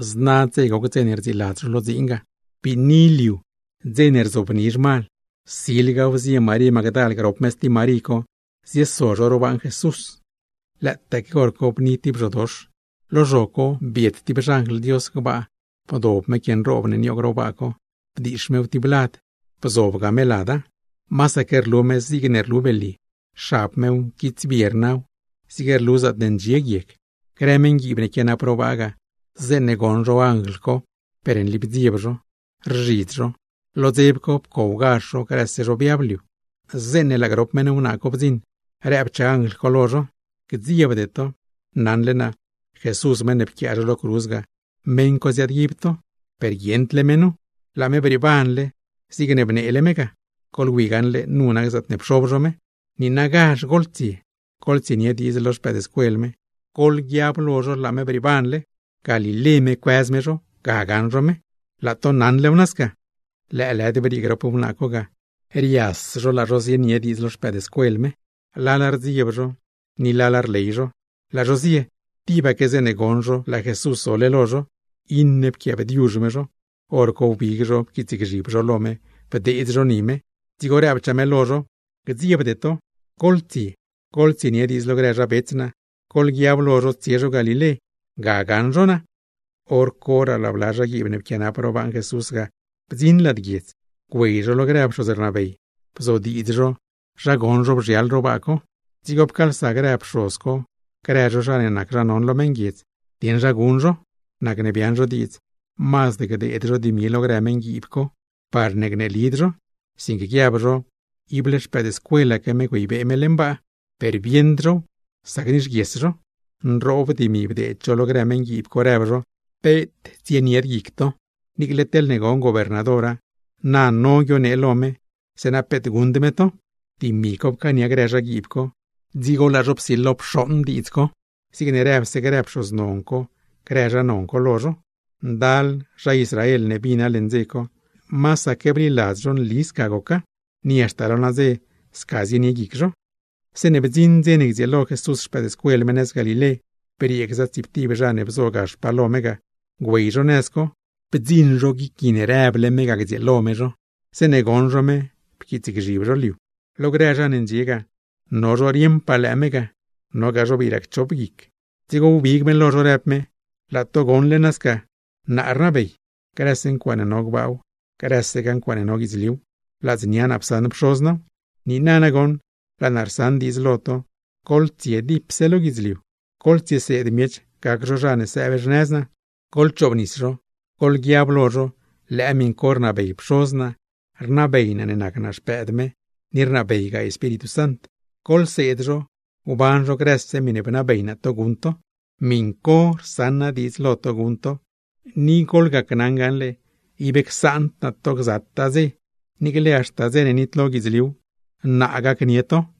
Zna dze goc dze ne rdziiladz zho lo dziin ga, biini liu, dze ne rsilo zhmal, silgaw zie Marí Magdal grop me stib Marí co zieso zho ro baaṉ Jesús. Lëëtaaque hor co bni tib zhodox, lo zho co biet tib xanjl Dios gbaa bdob me quie nroob ne nioog ro baa co, bdiix mew tib lad, bzobga me lada. Masaque rlu me zigne rlu belye, xab mew, nquitsbie rnaw, zig rlu zaatne ndxie guieg. Grë meṉguiib ne quianap ro baa ga, zeeṉe goṉ zho anjl co, per nli bdzieb zho, rzhidz zho. Lo dzeb co, pcowgazh zho, grëse zho biab liu. Zeeṉe laa grop wnaa co bdziṉ, rëbchaa anjl co lo zho: ―Gdziebde to. Naṉle naa Jesús meṉ ne pquiaa zho lo cruz ga, meṉ co ziaadguib to. Per guieṉdle me nu, ¡laa me brieebanle zigne bneele me ga! Goḻwi gaṉle nu nac zaatne pxob zho me. Niinagazh goḻtsie goḻtsienie diidz lo xpëëdscuel me, goḻguiab lo zho laa me brieebanle. Galilé me cuëz me zho, ga gaṉ zho me. Laa to naṉlew nasca. Lëëlëd briee grop wnaa co ga, rias zho laa zho zienie diidz lo xpëëdscuel me; lala rdzieb zho, ni lala rley zho. Laa zho zie, tibaque zeeṉe goṉ zho laa Jesús zole lo zho, iṉe pquiaabdiuzh me zho. Horco wbig zho pquiitsgzhib zho lo me, bdeedz zho ni me. Dzigo rëbchaa me lo zho: ―Gdziebde to. Goḻtsie goḻtsienie diidz lo grë zha bets naa, goḻguiab lo zho tsie zho Galilé, ga gaṉ zho naa. Horcoraa laa bla zhaguiib ne pquianap ro baaṉ Jesús ga bdziṉ lad guiedz. Güey zho lo grë pxoz rnabey, bzodiidz zho zha goṉ zho bzhial ro baa co. Dzigo pcaalsa grë pxoz co grë zho zha ne nac zha non lo meṉguiedz, dieṉ zha guṉ zho. Nacne biaaṉ zho diidz, mazd gdeed zho dimi lo grë meṉguiib co, parne gneelid zho, sinque guiab zho, segur xpëëdscuelaque me güeybee me leṉ baa, per bieṉd zhow sac nixguies zho. Nroob dimi bdeed zho lo grë meṉguiib co, rëb zho: ―Peet tsienied guic to, niicle teḻne gon gobernadora na no guionee lo me, zeeṉa peet guṉd me to. Dimi co pcaania zho, dzigo laa zho psilo pxooṉ diidz co zigne rëbse grë zha co lo zho. Grë zha Israel ne bina leṉ dze co, masaque bliladz zho nli sca goca, ¡ni haxta lo nadze sca zienie guic zho! Zeeṉe bdziṉ dze ne gdzieelo Jesús xpëëdscuel me nëz Galilé, briee gza tsiiptib zha ne bzo gaxpaa lo me ga, güey zho nëz co; bdziṉ zho guic gui ne rëble me ga gdzieelo me zho. Zeeṉe goṉ zho me pquiitsgzhib zho liu. Lo grë zha ne ndxie ga, no zho rieṉpaa lëë me ga, nogaa zha ne bii racchop guic. Dzigo wbig me lo zho, rëb me: ―Laa to goṉle nasca naa rnabey. Grëse ncuaaṉe no gbaaw, nogaa guidzliuw, ladznia naa psaṉ Pxoz naaw. Niina nagoṉ, laa naa rsaṉ diidz lo to: goḻtsie dipse lo guidzliu, goḻtsieseed miech gac zho zha ne sëëb xnëz naa, goḻchoobnis zho, goḻguiab lo zho lëë miṉ co rnabey Pxoz naa, rnabey naa ne nac Xpëëd me, ni rnabeygaa Espíritu Sant. Goḻseed zho gban zho, grëse miṉe bnabey naa to guṉ to. Miṉ co rsaṉ naa diidz lo to guṉ to; ni gacnaṉ to gaṉle, ib csaand naa to, gzataa dzew niicle haxta dze ne nitlo guidzliuw, naa gacnie to.